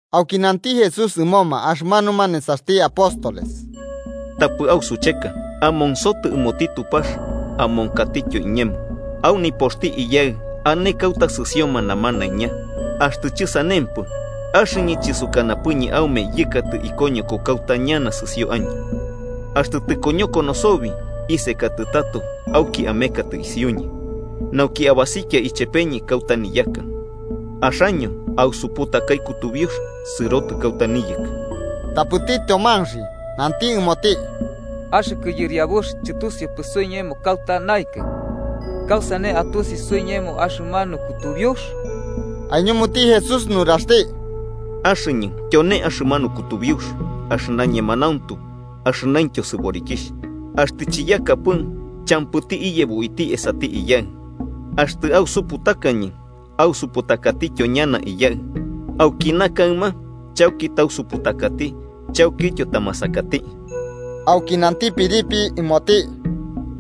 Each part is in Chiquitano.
Auki nanti Jesús ɨmoma axɨmanuma nesaxti apóstoles: Tapɨ ausucheka, amonsotɨ ɨmoti Tupax amonkatityo iñemo. Au nipoxti Iyaɨ ane kauta sɨsioma namanaiña. Axtɨ chɨsanempɨ, axɨñɨ chɨsukanapɨñɨ aume yɨkatɨ ikoñoko kauta ñana sɨsio año. Axtɨ tɨkoñokono sobi, isekatɨ tato auki amekatɨ isiuñɨ, nauki abasikia ichepeñɨ kauta niyaka. Axaño ausuputakai kutubiux sɨrotɨ kauta niyɨkɨ. Tapɨti Tyomanxi nanti ɨmoti: –Axɨkɨ Yɨriabux, chɨtusiupɨ suiñemo kauta naɨkɨ, ¿kausane atusi suiñemo axɨmanu kutubiux? Aiñumuti Jesús nuraxti: –Axɨñɨ tyone axɨmanu kutubiux, axɨna ñemanauntu axɨnaintyo sɨborikixh. Axtɨ chiyakapɨ, champɨti iyebo uiti esati Iyaɨ. Axtɨ ausuputakañɨ, ausuputakatityo ñana Iyaɨ. Auki na kaɨma chauki tausuputakati chaukityo tamasakati. Auki nanti Felipe ɨmoti: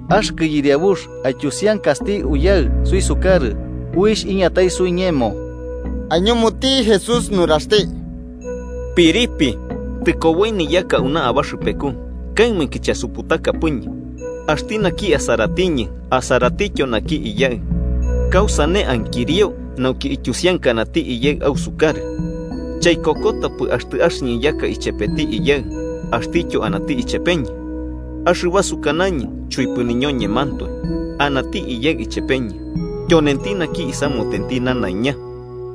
–Axɨkɨ Yɨriabux, aityusiankasti Uyaɨ suisukarɨ, uixh iñatai suiñemo. Aiñumuti Jesús nuraxti: –Felipe, tɨkoboi niyaka auna abaxɨpeku, ¿kaɨmainki chasuputakapɨñɨ? Axti naki asaratiñɨ, asaratityo naki Iyaɨ. ¿Kausane ankirio nauki ityusiankanati Iyaɨ ausukarɨ? ¿Chaikokotapɨ axtɨ axɨñɨ yaka ichepeti Iyaɨ axtityo anati ichepeñɨ? Axɨba sukanañɨ chuipɨ niñoñemantoe. Anati Iyaɨ ichepeñɨ, tyonenti naki isamutenti nanaiña.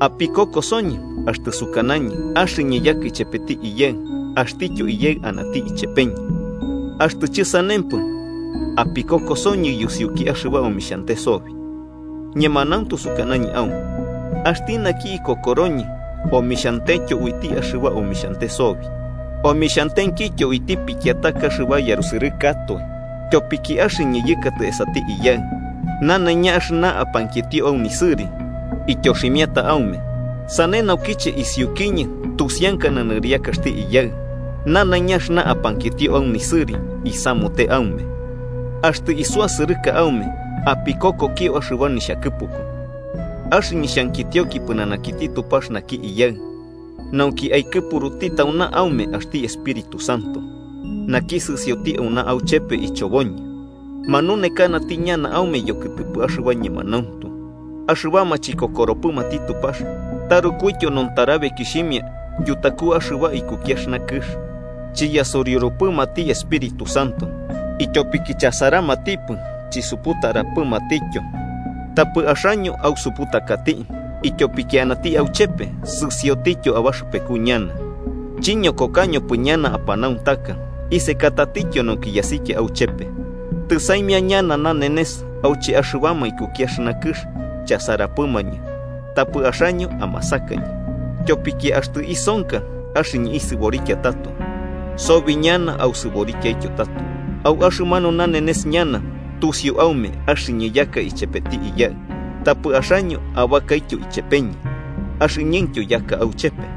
Apikokosoñɨ axtɨ sukanañɨ axɨñɨ yaka ichepeti Iyaɨ axtityo Iyaɨ anati ichepeñɨ. Axtɨ chɨsanempɨ apikokosoñɨ yusiuki axɨba omixhante sobi. Ñemanauntu sukanañɨ aume axti naki ikokoroñɨ, omixhantetyo uiti axɨba omixhante sobi, omixhantenkityo uiti pikiataka axɨba yarusɨrɨkatoe. Tyopiki axɨñɨ yɨkatɨ esati Iyaɨ. Nanaiña axɨna apankitio au nisɨri, ityoximiata aume, sane naukiche isiukiñɨ tusiankana nɨriakaxti Iyaɨ. Nanaiña axɨna apankitio au nisɨri isamute aume. “Axtɨ isuasɨrɨka aume, apikokokio axɨba nixhakɨpuku. Axɨñɨ xhankitioki pɨnanakiti Tupax naki Iyaɨ, nauki aikɨpuruti tauna aume axti Espíritu Santo, naki sɨsioti auna auchepe ichoboñɨ. Manunekanati ñana aume yokɨtɨpɨ axɨba ñemanauntu. Axɨbama chikokoropɨmati Tupax tarukuityo nontarabekixhimia yutaku axɨba ikuki axɨna kɨx, chiyasuriurupɨmati Espíritu Santo, ityopiki chasaramatipɨ chisuputarapɨmatityo. Tapɨ axaño ausuputakati ityopiki anati auchepe, sɨsiotityo abaxɨpeku ñana. Chiñokokañopɨ ñana apanauntaka, isekatatityo nauki yasikia auchepe. Tɨsaimia ñana nanenes auche axɨbama ikuki axɨna kɨx chasarapɨmañɨ, tapɨ axaño amasakañɨ. Tyopiki axtɨ isonka axɨñɨ isɨborikia tato, sobi ñana ausɨborikiaityo tato. Au axɨmanu nanenes ñana, tusiu aume axɨñɨ yaka ichepeti Iyaɨ, tapɨ axaño abakaityo ichepeñɨ, axɨñɨntyo yaka auchepe.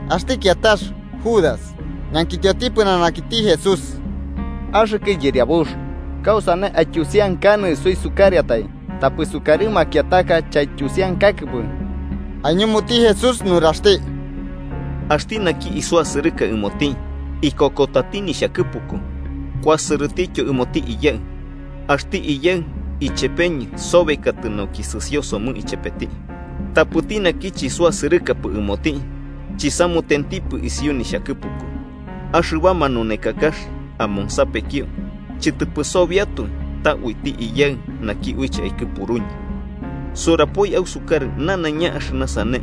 Axti kiatax Judas ñankitioti pɨnanakiti Jesús: –Axɨkɨ Yɨriabux, ¿kausane aityusiankanɨ suisukarɨatai tapɨ sukarɨ makiataka chaityusiankakɨpɨ? Aiñumuti Jesús nuraxti: –Axti naki isuasɨrɨka ɨmoti, ikokotati nixhakɨpuku. Kuasɨrɨtityo ɨmoti Iyaɨ, axti Iyaɨ ichepeñɨ sobekatɨ nauki sɨsio somɨ ichepeti. Tapɨti naki chisuasɨrɨkapɨ ɨmoti, chisamutentipɨ isiu nixhakɨpuku. Axɨba manunekakax amonsapekio chɨtɨpɨ sobiatoe, ta uiti Iyaɨ, naki uiche aikɨpuruñɨ. Surapoi ausukarɨ nanaiña axɨna sane,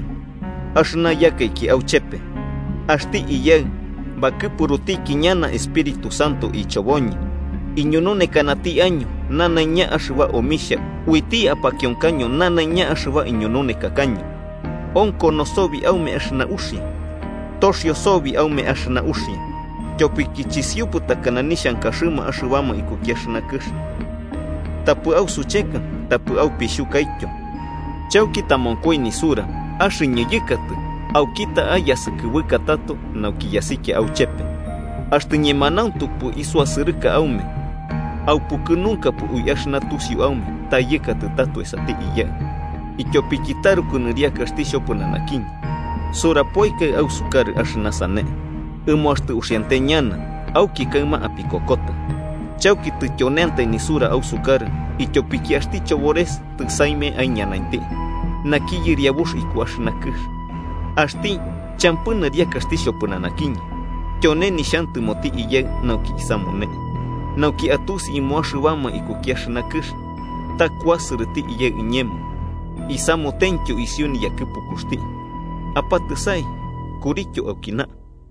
axɨna yakaiki auchepe. Axti Iyaɨ bakɨpurutiki ñana Espíritu Santo ichoboñɨ, iñununekanati año nanaiña axɨba omixha, uiti apakionkaño nanaiña axɨba iñununekakaño. “Onkono sobi aume axɨna uxia. Toxio sobi aume axɨna uxia, tyopiki chisiupɨ takana nixhankaxɨma axɨbama ikuki axɨna kɨx. Tapɨ ausucheka tapɨ aupixhukaityo. Chauki tamonkoi nisura axɨñɨ yɨkatɨ auki ta'a yasɨkɨbɨka tato nauki yasikia auchepe. Axtɨ ñemanauntupɨ isuasɨrɨka aume, aupukɨnunkapɨ ui axɨna tusiu aume ta yɨkatɨ tato esati Iyaɨ, ityopiki taruku nɨriakaxti xhopɨnanakiñɨ. Surapoikai ausukarɨ axɨna sane, ɨmo axtɨ uxiante ñana, auki kaɨma apikokota. Chauki tityoneantai nisura ausukarɨ ityopiki axti chobores tɨsaimia aiñanainti naki yɨriabuxti iku axɨna kɨx. Axti champɨ nɨriakaxti xhopɨnanakiñɨ, tyone nixhantɨmoti Iyaɨ nauki isamune, nauki atusi ɨmo axɨbama ikuki axɨna kɨx ta kuasɨrɨti Iyaɨ iñemo isamutentyo isiu yakɨpukuxti. “Apatɨsai, kurityo aukina.